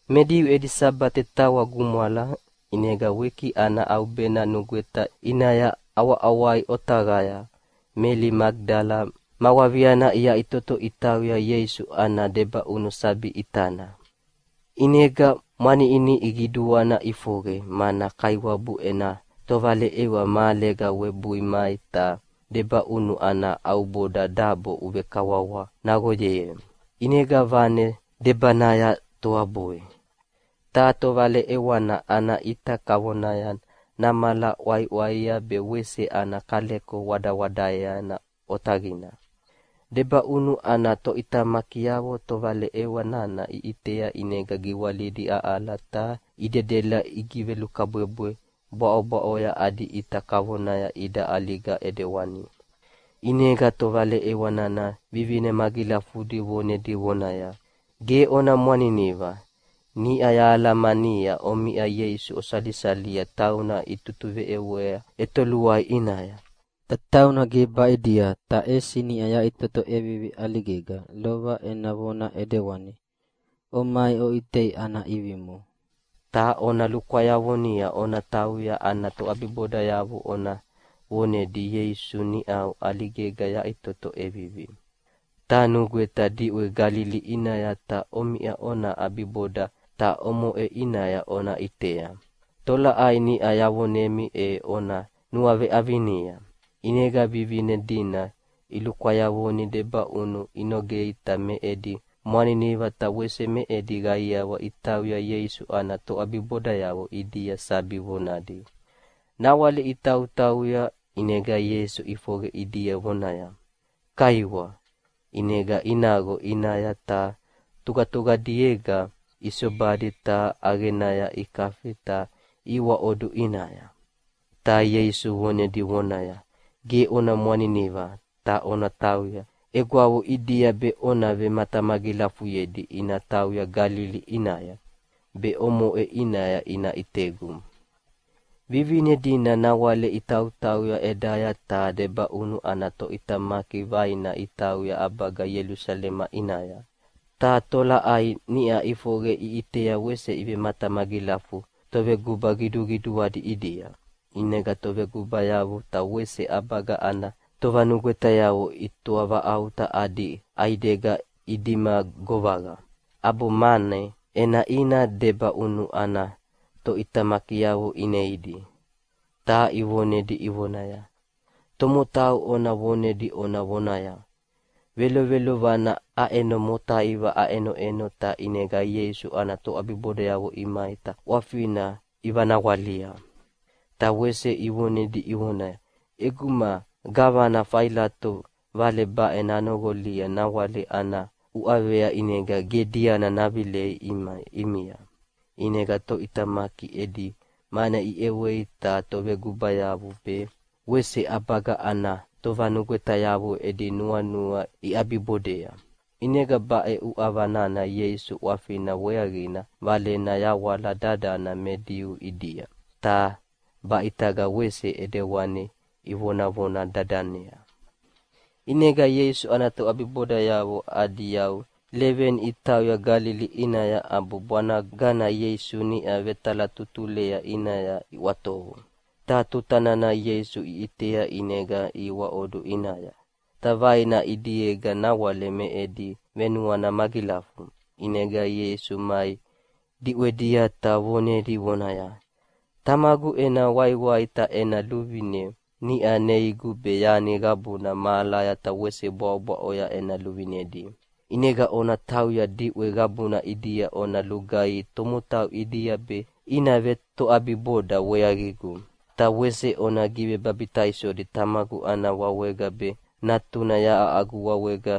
Me Diu edi Sabate tawa gumwala, ʼinega wiki ana ʼaubena nugweta ʼinaya ʼawaʼawai otaqaya Meli Magidala ma waviana iyaʼitoto itauya Ieisu ana debaʼunu sabi ʼitana. ʼInega mwaniʼiniʼi qiduana ʼifoqe, mana Kaiwabu ena tovaleʼewa mahalega webui mai ta debaʼunu ana ʼauboda dabo ʼuvekawawa naqoyei, ʼinega vane debanaya toabui. Ta tovaleʼewana ana ʼita kavonaya namala ʼwaiʼwaia be wese ana kaleko wadawadaea otaqina. Debaʼunu ana toʼitamakiavo tovaleʼewa nana iʼitea ʼinega giwalidi aʼala ta idedela igivelukabwebwe bwaʼobwaʼoya adi ʼita kavona ida ʼaliga ʼidewani. ʼInega tovaleʼewa nana vivine magilafudi vonedi vonaya, “Ge ona mwaniniva! Niʼa yahalamania omiʼa Ieisu osalisalia tauna itutuveʼewea ʼetoluai ʼinaya. Ta tauna ge baʼidia, ta ʼesi niʼa yaʼitoto ʼevivi ʼaligega, lova ena vona ʼidewani. Omai oʼitei ana ʼivimo. Ta ona lukwayavoni ona tauya ana toʼabibodayavo ona vonedi, ‘Ieisu niʼau ʼaligega yaʼitoto ʼevivi, ta nanugweta diʼwe Galili ʼinaya ta omiʼa ona ʼabiboda, ta omoʼe ʼinaya ona ʼitea’. Tolaʼai niʼa yavonemi e ona nuaveʼavinia.” ʼInega vivine dina ilukwayavoni debaʼunu inogea ta me edi mwaniniva ta wese me edi qaiawa itauya Ieisu ana toʼabibodayavo ʼidia sabi vonadi. Nawale itautauya, ʼinega Ieisu ʼifoqe ʼidia vonaya, “Kaiwa.” ʼInega inaqo ʼinaya ta tuqatuqadiega isobadi ta ʼaqenaya ikafi ta ihiwaʼodu ʼinaya. Ta Ieisu vonedi vonaya, “Ge ona mwaniniva, ta ona tauya egwavo ʼidia be ona vematamagilafuyedi ina tauya Galili ʼinaya, be omoʼe ʼinaya ina ʼitegu.” Vivine dina nawale itautauya ʼedaya ta debaʼunu ana toʼitamaki vaina itauya ʼabaga Ielusalema ʼinaya, ta tolaʼai niʼa ʼifoqe iʼitea wese ivematamagilafu toveguba qiduqiduadi ʼidia. ʼInega tovegubayavo ta wese ʼabaga ana tovanugwetayavo itoavaʼauta adi ʼaidega idima govaqa, ʼabo mane ʼenaʼina debaʼunu ana toʼitamakiavo ineidi, ta ivonedi ivonaya, “Tomotau ona vonedi ona vonaya, ‘Velovelovanaya aʼeno motaiva aʼenoʼeno ta ʼinega Ieisu ana toʼabibodayavo imai ta ʼwafina ivanawalia!’” Ta wese ivonedi ivonaya, “ʼEguma gavana Failato vale baʼe nanoqolia nawale ana uʼavea ʼinega ge diana navilei ʼimia.” ʼInega toʼitamaki edi mane iʼewei ta tovegubayavo be wese ʼabaga ana tovanugwetayavo edi nuanua iʼabibodea. ʼInega baʼe uʼava nana Ieisu ʼwafina weaqina valena yawala dadana me Diu ʼidia, ta baʼitaga wese ʼidewani ivonavona dadanea. ʼInega Ieisu ana toʼabibodayavo adi yau leveni itauya Galili ʼinaya ʼabo bwanagana Ieisu niʼa vetalatutulea ʼinaya iʼwatovu. Ta tuta nana Ieisu iʼitea ʼinega ihiwaʼodu ʼinaya. Ta vaina ʼidiega nawale me edi venuana magilafu. ʼInega Ieisu mai diʼwedia ta vonedi vonaya, “Tamagu ena waiwai ta ena luvine niʼa neigu be yani qabuna mahalaya ta wese bwaʼobwaʼoya ena luvinedi. ʼInega ona tauya diʼwe qabuna ʼidia ona lugaihi tomotau ʼidia be ina vetoʼabiboda weaqigu. Ta wese ona givebabitaisodi Tamagu ana wawega be Natuna yaʼa agu wawega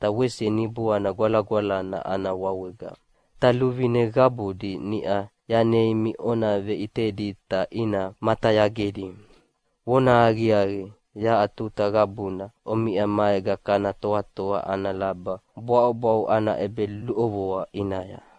ta wese Niboana Gwalagwalana ana wawega. Ta luvine qabudi niʼa yaneimi ona veʼitedi ta ina matayagedi. Vonahaqiaqi, yaʼa tuta qabuna omiʼa maega kana toatoa ana laba bwaʼobwaʼo ana ʼebeluʼovoa ʼinaya.”